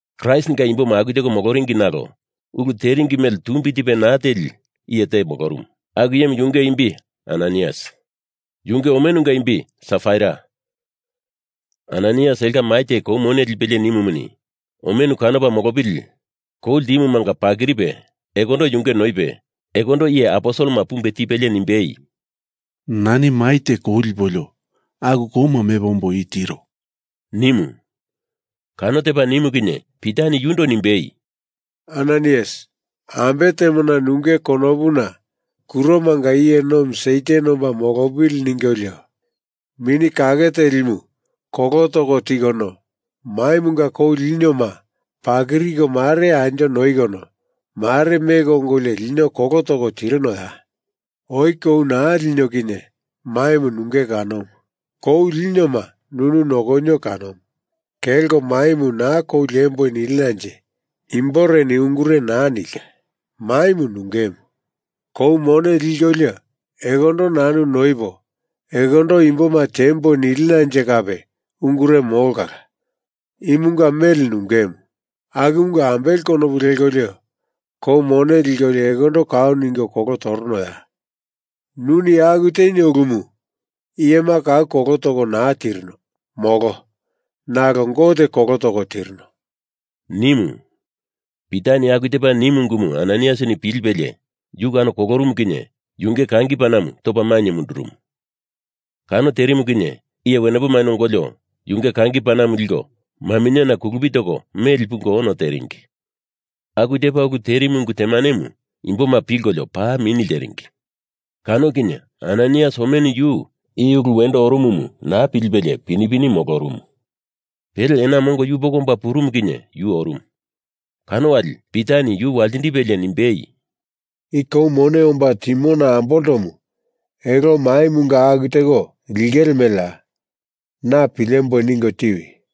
Kraistinga imboma aku teko moloringi nalo ulu teringi mele tumbi tipe naa teli iye te molorumu, aku iyemu yunge imbimu Ananaias. Yunge omenumunga imbi Safaira. Ananaiasini elonga mai te kou mone lipelie nimumuni, omenu kanopa molopili kou ltimumanga pakiripe ekondo yunge noipe ekondo iye aposelema pumbe tipelie nimbei, “Nani mai te kou lipolio aku kouma mepo ombo i tiro,” nimu. Kano tepa nimu kinye Pitani yundo nimbei, “Ananaias, ambe temona nunge konopuna kuromanga iye nomi Satan omba molopili ningolio Mini Kake Telimu kolo toko tikono, maimunga kou linioma pakiriko mare anjo noikono mare meko ongolio lino kolo toko tirinoya? Oi kou naa linio kinye maimu nunge kanomu. Kou linioma nunu nokonio kanomu. Kelko maimu na kou liemboi nilinanje imbore ungure naa nilka. Maimu nungemu. Kou mone likolio ekondo nanu noipo ekondo imboma tiemboi nilinanje kape ungure molo kala. Imunga mele nungemu. Akumunga ambele konopu lekolio kou mone likolio ekondo kau ningo kolo toronoya? Nuni aku tenio ulumu iyema kau kolo toko naa tirino, molo. Nalo Gote kolo toko tirino,” nimu. Pitani aku tepa nimu ungumu Ananaias pilipelie, yu kano kolorumu kinye yunge kangi panamu topa mainye mundurumu. Kano terimu kinye iye wenepoma ongolio yunge kangi panamu liko maminyeni kulupi toko meli pungo ono tepuringi. Aku tepa ulu terimu ungu temanemu imboma pilkolio paa mini lteringi. Kano kinye Ananaias omenu yu i ulu wendo orumumu naa pilipelie pini pini molorumu. Pele ena mongo yupoko omba purumu kinye yu orumu. Kano wali Pitani yu waltindipelie nimbei, “I kou mone omba timona amboltomu elo maimunga aku teko lingele meleya? Na pilemboi ningo tiwi,”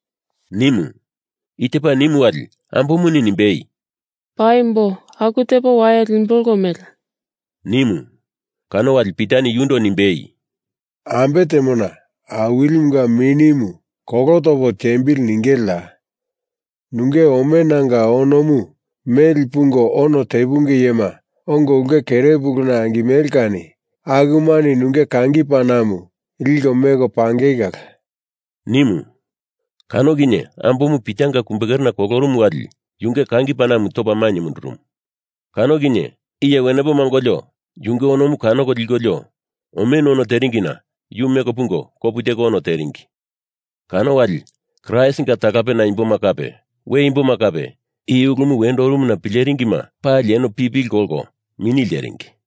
nimu. I tepa nimu wali ambomuni nimbei, “Paimbo aku tepo waye limbolo mele,” nimu. Kano wali Pitani yundo nimbei, “Ambe temona Awilimunga Minimu kolo topo tiembili ningeleya? Nunge omenanga onomu meli pungo ono tepunge iyema ongo ulke kere puluna angimele kani akumani nunge kangi panamu liko meko pangei kala,” nimu. Kano kinye ambomu Pitanga kumbekerena kolorumu wali yunge kangi panamu topa mainye mundurumu. Kano kinye iye wenepoma ongolio yunge onomu kanoko likolio omenu ono teringina yu meko pungo kopu teko ono teringi. Kano wali Kraistinga talapena imboma kape we imboma kape i ulumu wendo orumuna pileringima palini eno pipili kolkolio mini lteringi.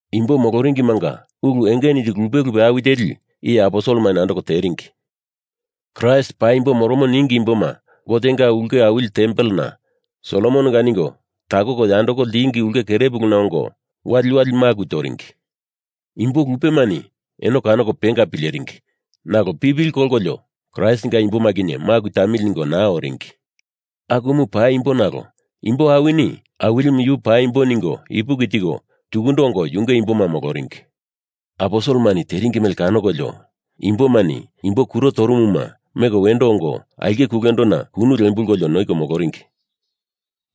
Imbo moloringimanga ulu enge nili lupe lupe awi teli iye aposelemani andoko teringi. Kraist paimbo moromo ningi imboma Gotenga ulke awili tempelena Solomononga ningo takoko yandoko ltingi ulke kere puluna ongo waliwali maku toringi. Imbo lupemani eno kanoko penga pileringi nalo pipili kolkolio Kraistinga imboma kinye maku tamili ningo naa oringi. Akumu paimbo nalo imbo awini Awilimu yu paimbo ningo ipuki tiko tukundo ongo yunge imboma moloringi. Aposelemani teringi mele kanokolio imbomani imbo kuro torumuma meko wendo ongo aulke kulendona kunu lembulkolio noiko moloringi.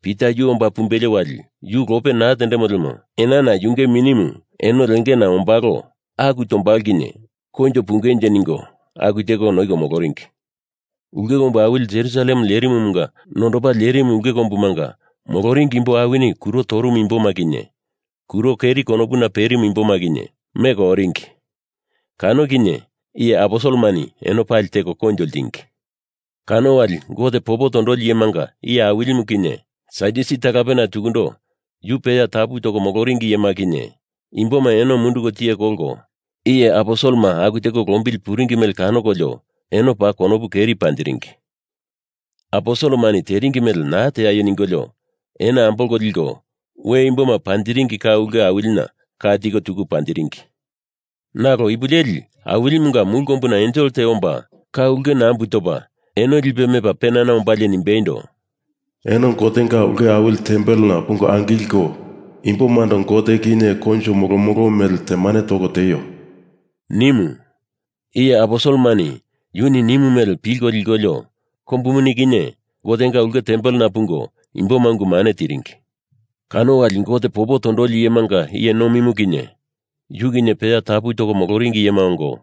Pita yu omba pumbelo wali yu lope naa tendemo lemo enana yunge minimu eno lengena ombalo aku tombalo kinye koinjo pungenje ningo aku teko noiko moloringi. Ulke kombu awili Jerusalem lerimumunga nondopa lerimu ulke kombumanga moloringi imbo awini kuro torumu imboma kinye kuro keri konopuna perimu imboma kinye meko oringi, kano kinye iye aposelemani eno pali teko koinjo ltingi. Kano wali Gote popo tondoli iyemanga iye awilimu kinye, Sadyusi talapena tukundo yu peya tapu toko moloringi iyema kinye imboma eno munduko tiye kolko iye aposelema aku teko lombili puringi mele kanokolio eno paa konopu keri panjiringi. Aposelemani teringi mele naa teaio ningolio eno ambolko liko we imboma panjiringi ka ulke awilina ka tiko tuku panjiringi. Nalo ipu leli Awilimunga mulu kombuna ensel te omba ka ulke nambu topa eno lipe mepa penana ombalie nimbeindo, “Eno Gotenga ulke awili tempelena pungo angilko imbomando Gote kinye koinjo molomolo mele temane toko tieio,” nimu. Iye aposelemani yuni nimu mele pilko likolio kombu muni kinye Gotenga ulke tempelena pungo imboma ungu mane tiringi. Kano wali Gote popo tondoli iyemanga iye nomimu kinye yu kinye peya tapu toko moloringi iyema ongo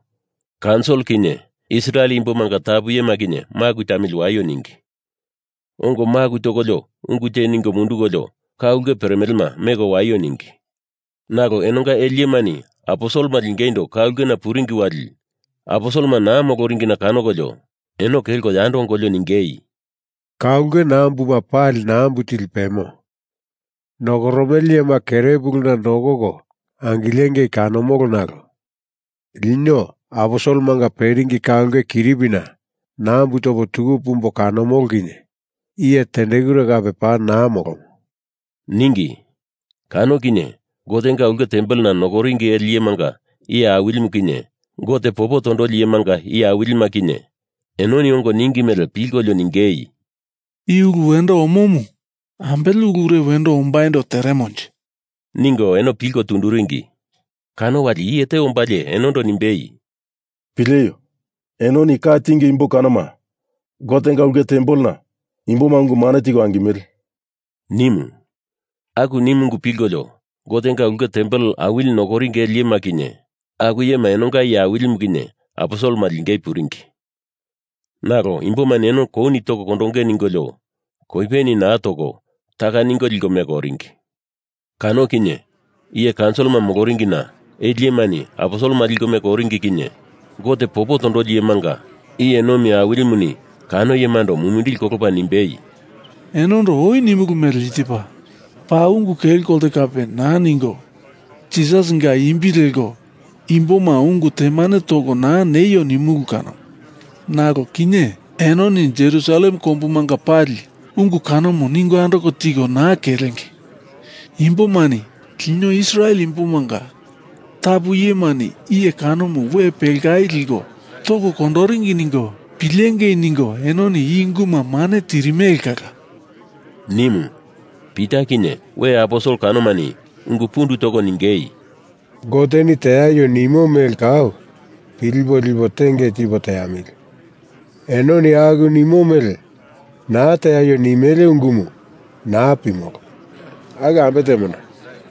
kaunsil kinye Israel imbomanga tapu iyema kinye maku tamili waio ningi. Ongo maku tokolio ungu te ningo mundukolio ka ulke peremelema meko waio ningi. Nalo enonga ele iyemani aposelema lingeindo ka ulkena puringi wali aposelema naa moloringina kanokolio eno kelko yando ongolio ningei, “Ka ulke nambuma pali nambu tili pemo nokoromele iyema kerepuluna nokoko angilengei kanomolo nalo lino aposelemanga peringi ka ulke kiripina nambu topo tuku pumbo kanomolo kinye iye tendekure kape paa naa molomo,” ningi. Kano kinye Gotenga ulke tempelena nokoringi ele iyemanga iye awilimu kinye Gote popo tondoli iyemanga iye awilima kinye enoni ongo ningi mele pilkolio ningei, “I ulu wendo omomu ambele ulure wendo ombaindo teremonje,” ningo eno pilko tunduringi. Kano wali iye te ombalie enondo nimbei, “Pileio, enoni ka tinge imbo kanoma Gotenga ulke tempelena imboma ungu mane tiko angimele,” nimu. Aku nimu ungu pilkolio Gotenga ulke tempel awili nokoringi ele iyema kinye aku iyema enonga iye awilimu kinye aposelema lingei puringi. Nalo imbomani eno kouni toko kondonge ningolio koipeni naa toko taka ningo liko meko oringi. Kano kinye iye kaunsilima moloringina ele iyemani aposelema liko meko oringi kinye Gote popo tondoli iyemanga iye nomi awilimuni kano iyemando mumindili kolopa nimbei, “Enondo oi nimulu mele i tepa. Paa ungu kelo kolte kape naa ningo Jisasinga imbi leko imboma ungu temane toko naa neio nimulu kanomu. Nalo kinye enoni Jerusalem kombumanga pali ungu kanomu ningo andoko tiko naa kelenge. Imbomani lino Israel imbomanga tapu iyemani iye kanomu we pelkai liko toko kondoringi ningo pilengei ningo enoni i unguma mane tirimele kala,” nimu. Pita kinye we aposel kanomani ungu pundu toko ningei, “Goteni teaio nimo mele kau pilipo lipo tenge tipo teamili. Enoni aku nimo mele naa teaio nimele ungumu naa pimolo. Aku ambe temona,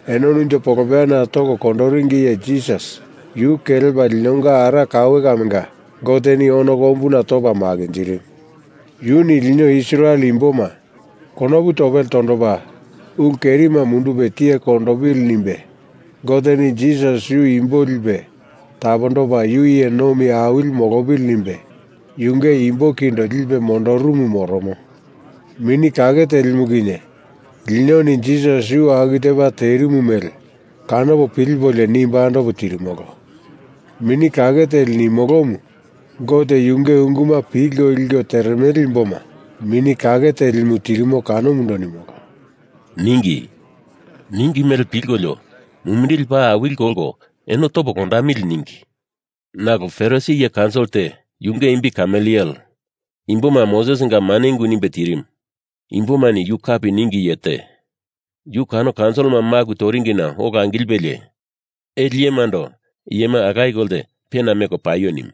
enoni unjo polopeyana toko kondoringi Iye Jisas yu kelepa linonga ara kaue kamenga Goteni ono kombuna topa makinjirimu. Yuni lino Israel imboma konopu topele tondopa ulu kerima mundupe tiye kondondopili nimbe Goteni Jisas yu imboma lipe tapondopa yu iye nomi awili molopili nimbe yunge imbo kindo lipe mondurumu moromo. Mini Kake Telimu kinye linoni Jisas yu aku tepa terimu mele kanopo pilipolio nimbo andopo tirimolo. Mini Kake Teli nimolomu Gote yunge unguma pilko liko teremele imboma Mini Kake Telimu tirimo kanomundo nimolo,” ningi. Ningi mele pilkolio mumindili paa awili kolko eno topo kondamili ningi. Nalo Farisi iye kaunsil te, yunge imbi Kameliele, imboma Mosesinga mane ungu nimbe tirimu. Imbomani yu kapi ningi iye te. Yu kano kaunsilima maku toringina ola angilipelie ele iyemando iyema alaye kolte pena meko paio nimu.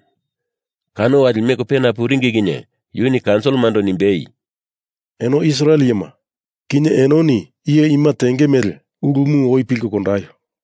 Kano wali meko pena puringi kinye yuni kaunsilimando nimbei, “Eno Israel iyema, kinye enoni iye ima tenge mele ulumu oi pilko kondaio.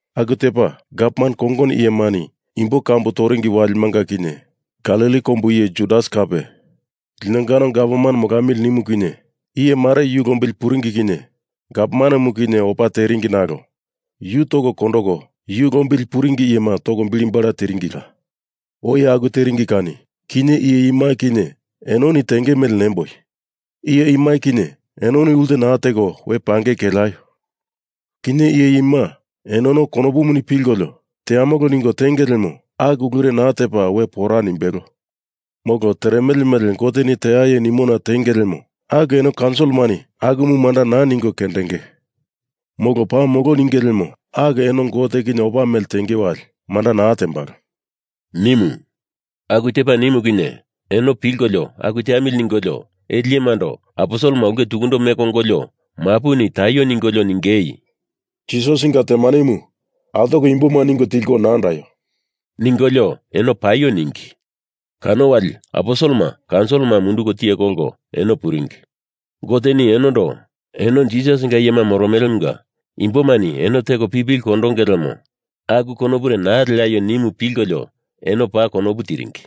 Aku tepa gavman kongono iyemani imbo kambu toringi walimanga kinye Galili kombu iye Judas kape linongano gavman molamili nimu kinye iye mare yu lombili puringi kinye gavmanemu kinye opa teringi nalo yu toko kondoko yu lombili puringi iyema toko bili bala tiringila. Oi aku teringi kani kinye iye ima kinye enoni tenge mele nemboi, iye ima kinye enoni ulte naa teko we pangei keleaio. Kinye iye ima enono konopuni pilkolio teamolo ningo tenge lemo aku ulure naa tepa we pora nimbelo. Molo, teremele mele Goteni teaio nimona tenge lemo aku eno kaunsilimani akumu manda naa ningo kendenge. Molo paa molo ninge lemo aku eno Gote kinye opa mele tenge wali manda naa tembalo,” nimu. Aku tepa nimu kinye eno pilkolio aku teamili ningolio ele iyemando aposelema ulke tukundo meko ongolio mapuni taio ningolio ningei, “Jisasinga temanemu altoko imboma ningo tilko naa andaio,” ningolio eno paio ningi. Kano wali aposelema kaunsilima munduko tiye kolko eno puringi. Goteni enondo eno Jisasinga iyema moromelemunga imbomani eno teko pipili kondonge lemo, aku konopure naa leaio, nimu pilkolio eno paa konopu tiringi.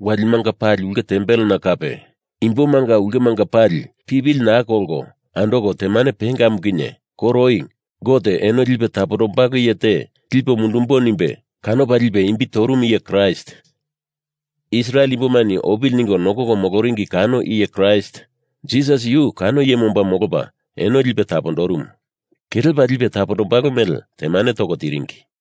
Walimanga pali ulke tempelena kape imbomanga ulkemanga pali pipili naa kolko andoko temane pengamu kinye koro oi Gote eno lipe tapondombalo iye te lipo mundumbo nimbe kanopa lipe imbi torumu iye Kraist Israel imbomani opili ningo nokoko moloringi kano iye Kraist, Jisas yu kano iyemu omba molopa eno lipe tapondorumu, kelepa lipe tapondombalo mele temane toko tiringi.